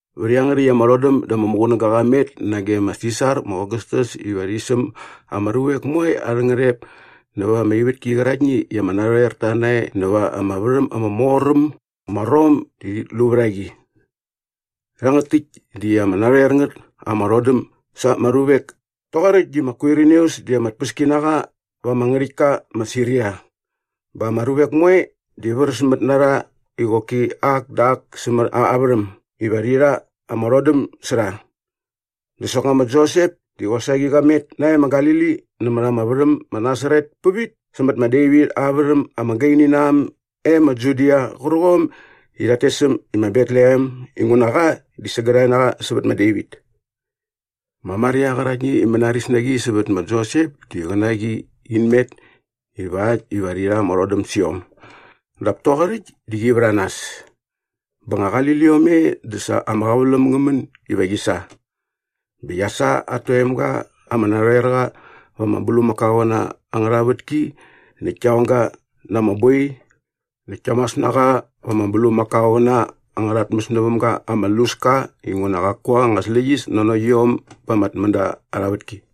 Vät iangärhäkt ama rhodäm dä ama muqunäga qa met nage ma Sisar ma Ogastas iva rhi säm ama ruvek moe arhä ngärhep nävät ama ivätki qäraktni i ama narhoerta nae näva ama värhäm ama mor äm ma Rom dit lu vät a qi. Rhangät täkt di ama narhoer ngät ama rhodäm sa ama ruvek toqoräkt i ma Kwirinius di ama tpäskinaqa va ama ngärhäktka ma Siria. Bä ama ruvek moe di vräsmät na rha i qoki ak dä ak sämät aa värhäm iva rhi rha ama rhodäm sä rha. Dä soknga ma Josep di qosaqi qa met nae ma Galili nämät ama värhäm ma Nasaret pävit sämät ma Devit aa värhäm ama gaini na äm e ma Judia qärqom i rhat tes äm i ma Betlehem inguna qa di sägärhae na qa sävät ma Devit. Ma Maria qäraktni i mänaris na qi sävät ma Josep di qä na qi in met ivakt iva rhi rha ama rhodäm sä iom. Dap toqoräkt di qi vät a nas. Bä nga qali liom e dä sa ama qäväläm ngä män iva qi sa. Bä qia sa at toemga ama narhoer qa va ama bulmakaoqäna angärha vätki näkt kia ong ga na ama boi näkt kia mas na qa va ama bulmakaoqäna angärha tmäs näväm ga ama luska inguna qaku anga släqyäs nanokt iom ba ama tmända arha vätki.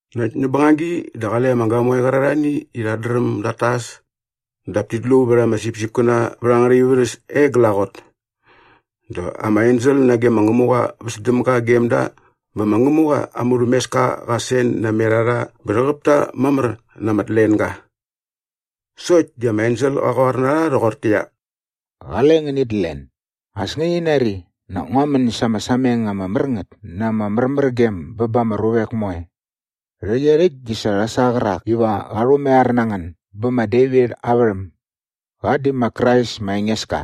Näkt näp bängagi dä qale ama gamoe qärarhani i rhat dräm dat tas dap tit lu vät ama sipsipkäna vät angärha ivärhäs e glaqot. Dä ama ensel nage ma Ngämuqa väs däm ga gem da bä ma Ngämuqa aa murhämeska qa sen namet a rha bä rhäqäp ta mamär na ama tlenga. Sokt di ama ensel qa qoar na rha rhoqortäqyia, “Qale ngänit len. As ngäni nari, nak ngua män sa ama sameng ama mär ngät na ama märmärgem bä ba ama ruvek moe. Rhäqyerhäkt di sa rha sa qärak iva qa rhumaiar na ngän bä ma Devit aa värhäm. Qa di ma Krais ma Engeska.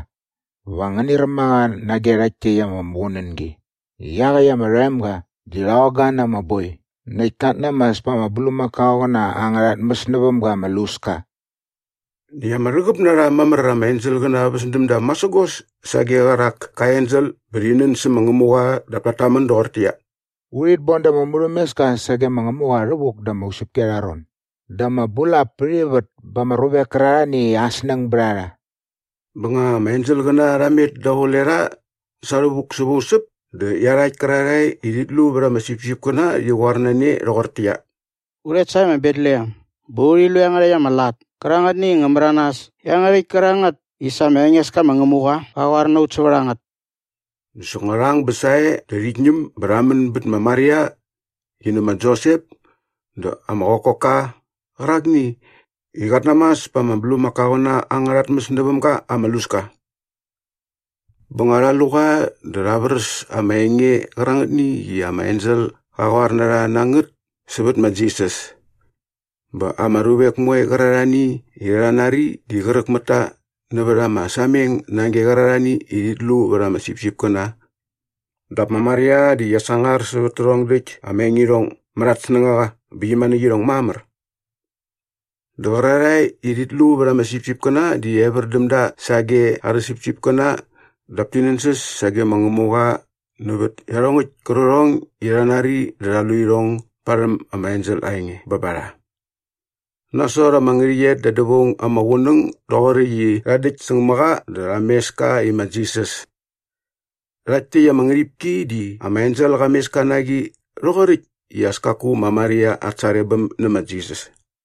Va ngäni räm a qa nage rhakt täkt ama muqunängi i iaqäkt ama rhoemga di rha ong ga na ama boi näkt kat namas pa ama bulmakaoqäna angärha tmäs näväm ga ama luska.” Näkt ama rhäqäp na rha mamär ama enselqäna väs däm da masägos sage qärak kä ensel bä rhi nän sä ma Ngämuqa dap tat tamän doqortäqyia, “Urhit boda ama murhämeska sage ma Ngämuqa rhävuk da ama usäpki arha ron dä ama bulap pät ivät ba ama ruvek kärarhani i aa snäng bät a rha.” Bä nga ama enselqäna rha met daqule rha sa rhävuk säva usäp dä iarhakt kärarhae i rhit lu vät ama sipsipkäna rhi qoar na ne rhoqortäqyia, “U rhet sae ma Betlehem bä urhi lu iangärhäkt ama lat kärangätni i ngä märanas iangärhäkt kärangät i sa ma Engeska ma Ngämuqa qa qoar na ut sävät a ngät.” Dä soknga rha ang bä sae dä rhit ñäm bä rha män bät ma Maria qi nä ma Josep dä ama qokokka qärakni i qat namas pa ama bulmakaoqäna angärha tmäs näväm ga ama luska. Bä nga rha lu qa dä rha vräs ama enge qärangätni i ama ensel qa qoar na rha na ngät sävät ma Jisas. Bä ama ruvek moe qärarhani i rha nari di qräk mät ta nävät ama sameng nage qärarhani i rhit lu vät ama sipsipkäna. Dap ma Maria di qia sangar sävät tärhong däkt ama engirhong mät at snängaqa bä qi manäkt irhong mamär. Dä qärarhae i rhit lu vät ama sipsipkäna di evär däm da sage arhä sipsipkäna dap ti nänsäs sage ma Ngämuqa nävät iarhongäkt kärqärhong i rha nari dä rha lu irhong barhäm ama ensel aa enge bä ba rha. Nasot ama ngärhäqyet da dävaung ama qunäng doqoräkt i rha däkt säng mä qa dä rha mes ka i ma Jisas. Rhakt täkt ama ngärhipki di ama ensel qa mes ka na qi rhoqoräkt i as kaku ma Maria at sarebäm nä ma Jisas.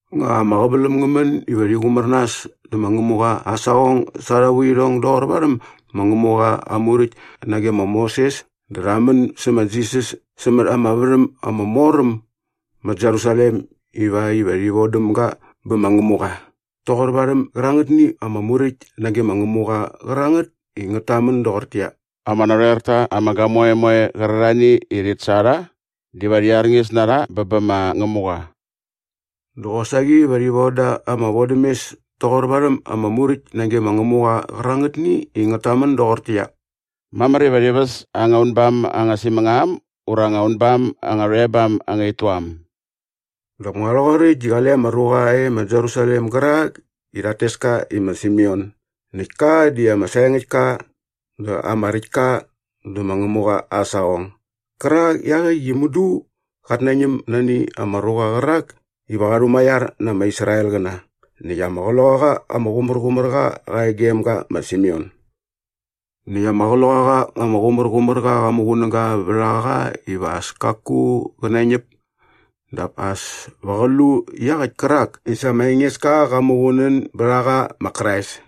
Nga ama qäväläm ngä män iva rhi qumär nas dä ma Ngämuqa aa saqong sa arha vuirhong doqor varhäm ma Ngämuqa aa Muräkt nage ma Moses dä rha män sä ma Jisas sämät ama värhäm ama mor äm ma Jerusalem ivakt iva rhi vodäm ga bä ma Ngämuqa toqor varhäm gärangätni ama Muräkt nage ma Ngämuqa qärangätni i ngät tamän doqortäqyia, “Ama narhoer ta ama gamoe moe qärarhani i rhit sa rha diva rhi arñis na rha bä bä ma Ngämuqa” dä qosaqi va rhi voda ama vodämes toqor varhäm ama Muräkt nage ma Ngämuqa qärangätni i ngät tamän doqortäqyia, “Mamär iva rhi väs anga unbam anga simängam ura anga unbam anga rhoebam anga ituam.” Dap nga rhoqoräkt di qale ama ruqa e ma Jerusalem gärak i rhat tes ka i ma Simeon näkt ka di ama saengäkt ka dä ama räkt ka dä ma Ngämuqa aa saqong gärak i iaqäkt di mudu qat nañäm nani ama ruqa qärak iva qa rhumaiar na ama Israelqäna näkt ama Qloqaqa ama Qumärqumärqa qa e gem ga ma Simeon. Näkt ama Qloqaqa ama Qumärqumärqa qa muqunäga vät a qa iva as kaku qä nañäp dap as pa qä lu iaqäkt kärak i sa ma Engeska qa muqunän bät a qa ma Krais.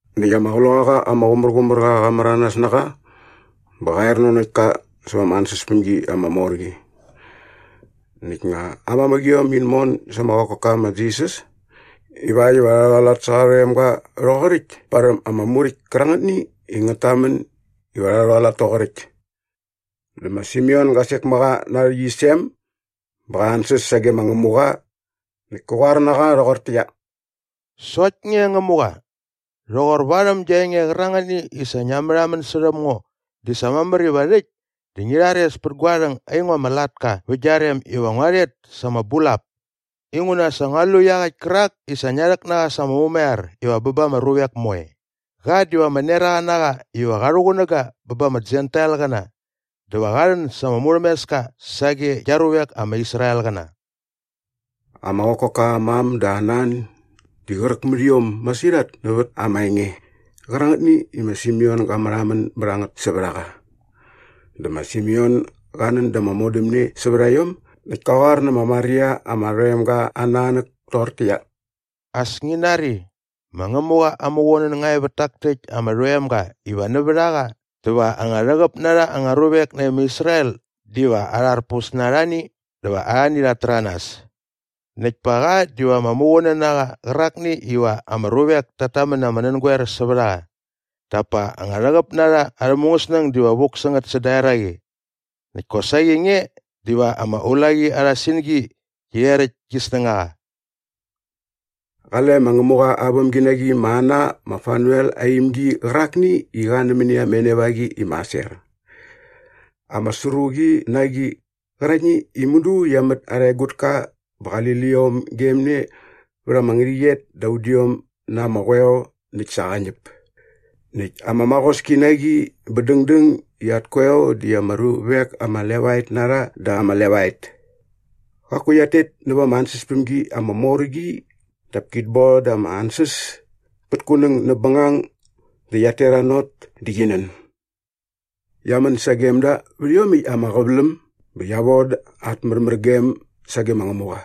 Näkt ama Qloqaqa ama Qumärqumärqa qa märanas na qa bä qa er nanokt ka säva ama ansäspämgi ama mor qi näkt nga ama ngätmamäqiom in mon sa ama qokokka ma Jisas ivakt iva rha rhualat sä qa rhoemga rhoqoräkt parhäm ama Muräkt kärangätni i ngät tamän iva rha rhualat toqoräkt dä ma Simeon ga sek mä qa na aa rhäqyisem bä qa ansäs sage ma Ngämuqa näkt kä qoar na qa rhoqortäqyia, “Sokt nge Ngämuqa, rhoqor varhäm gia enge qärangätni i sa ngia märhamän särhäm ngo di sa mamär iva rhäkt di ngi rhares pät gua rhäng aingo ama latka vä gia rem iva ngua rhet sa ama bulap inguna sa ngua lu iaqäkt kärak i sa ngia rhäk na qa sa ama mumaiar iva bä ba ama ruvek moe. Qa diva ama neraqa na qa iva qa rhuqunäga bä ba ama Jentailqäna dä va qa rhän sa ama murhämeska sage gia ruvek ama Israelqäna.” Ama qokokka aa mam dä aa nan di qräk mät iom masirhat nävät ama enge qärangätni i ma Simeon ga märhamän bät a ngät sävät a qa. Dä ma Simeon ga nän da ama modämne sävät a iom näkt kä qoar nä ma Maria ama rhoemga aa nanäk toqortäqyia, “As ngi nari, ma Ngämuqa aa muqunän nga e vät tak täkt ama rhoemga iva nävät a qa dä va anga rhäqäp na rha anga ruvek nae ma Israel diva arharpus na arhani dä va arhani rhat täranas. Näkt pa qa diva ama muqunän na qa qärakni iva ama ruvek tat tamän na ama nängoer sävät a qa dap pa anga rhäqäp na rha arhä mungäsnäng diva vuk sä ngät säda eraqi. Näkt kosaqi nge diva ama ulaqi arha singi qi rheräkt gi snängaqa.” Qale ma Ngämuqa aa vämginaqi ma Ana ma Fanuel aa imgi qärakni i qa nämäni ama enevaqi i ma Aser. Ama sru qi na qi qäraktni i mudu qia mät arha egutka bä qali liom gem ne vät ama ngärhäqyet da ama udiom na ama qoeo näkt sa qa ñäp näkt ama maqoski na qi bä dängdäng i at koeo di ama ruvek ama levaet na rha da ama levaet. Qaku qiat tet näva ama ansäspämgi ama mor qi dap kit boda ama ansäs pät kunäng näp bängang dä qiat teranot dä qi nän. Qia män sagem da vät iomäkt ama qäväläm bä qia voda at märmärgem sage ma Ngämuqa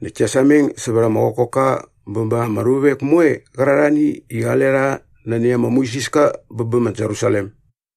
näkt kia sameng sävät ama qokokka bä ba ama ruvek moe qärarhani i qale rha nani ama muisiska bä bä ma Jerusalem.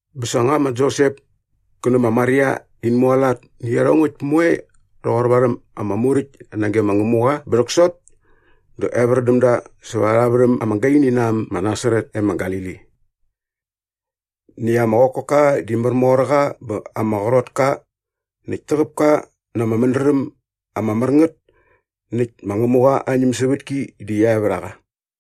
Bä sa nga ma Josep kä nä ma Maria in mualat nä iarhongäkt moe rhoqor varhäm ama Muräkt nage ma Ngämuqa bä rhäksot dä evär däm da säva arha värhäm ama gaini na äm ma Nasaret e ma Galili. Näkt ama qokokka di märmor qa bä ama qrot ka näkt täqäp ka na ama mädräm ama mär ngät näkt ma Ngämuqa aa ñämsävätki di qia e vät a qa.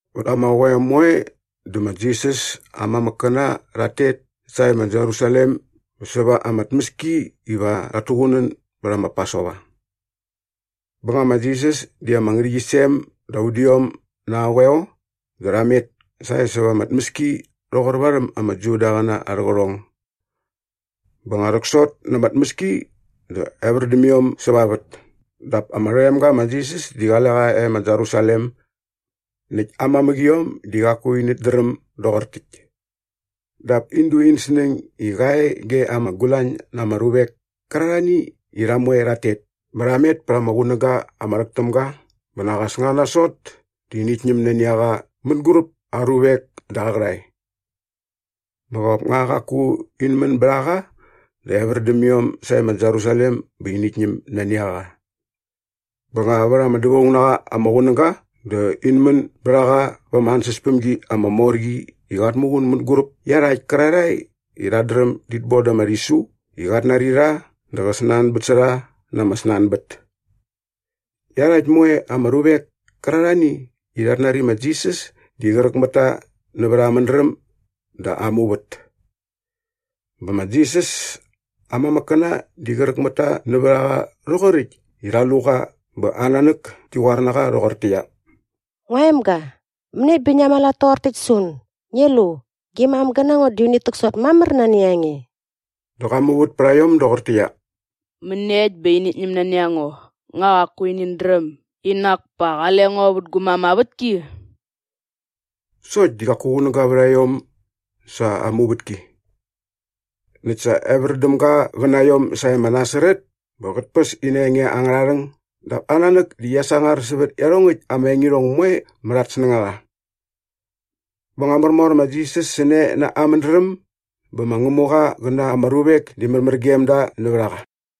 Vät ama qoeo moe dä ma Jisas aa mamäkkäna rhat tet sae ma Jerusalem bä säva ama tmäski iva rhat tuqunän bät ma Pasova. Bä nga ma Jisas di ama ngärhäqyisem da udiom na aa qoeo dä rha met sae säva ama tmäski rhoqor varhäm ama Judaqäna arhä qärhong. Bä nga rhäksot na ama tmäski dä evär däm iom säva vät dap ama rhoemga ma Jisas di qale qa e ma Jerusalem. Näkt aa mamäqiom di qaku inät dräm doqor täkt. Dap in du in snäng i qa e ge ama gulañ na ama ruvek kärarhani i rha moe rhat tet bä rha met pät ama qunäga ama rhäk täm ga bä nak as nga nasot dä init ñäm nani a qa mänguräp aa ruvek dä aa qärhae. Bä qop nga qaku in män bät a qa dä evär däm iom sae ma Jerusalem bä init ñäm nani a qa. Bä nga vät ama dävaung na qa ama qunäga dä in män bät a qa va ama ansäspämgi ama mor qi i qat muqun mänguräp iarhakt kärarhae i rhat dräm dit boda ama rhisu i qat nari rha dä qä snanbät sä rha na ama snanbät. Näkt iarhakt moe ama ruvek kärarhani i rhat nari ma Jisas di qräk mät ta nävät aa mädräm dä aa muvät. Bä ma Jisas aa mamäkkäna di qräk mät ta nävät a qa rhoqoräkt i rha lu qa bä aa nanäk ki qoar na qa rhoqortäqyia, “Ngua emga, mäniekt bä ngia mualat toqor täkt sä un? Ngi lu, gi mam gä na ngo di unit täksot mamär nani a nge.” Dä qa muvät pät a iom doqortäqyia, “Mäniekt bä va init ñäm nani a ngo? Nak nga qaku inät dräm i nak pa qale ngo vä gu mam aa vätki?” Sokt di qaku qunäga vät a iom sa aa muvätki. Näkt sa evär däm ga qä na iom sae ma Nasaret bä qät päs ina enge angärha rhäng dap aa nanäk di qia sangar sävät iarhongäkt ama engirhong moe mät at snängaqa. Bä märmor ma Jisas sä ne na aa mädräm bä ma Ngämuqa qä na ma ruvek di sa märmär gem da nävät a qa.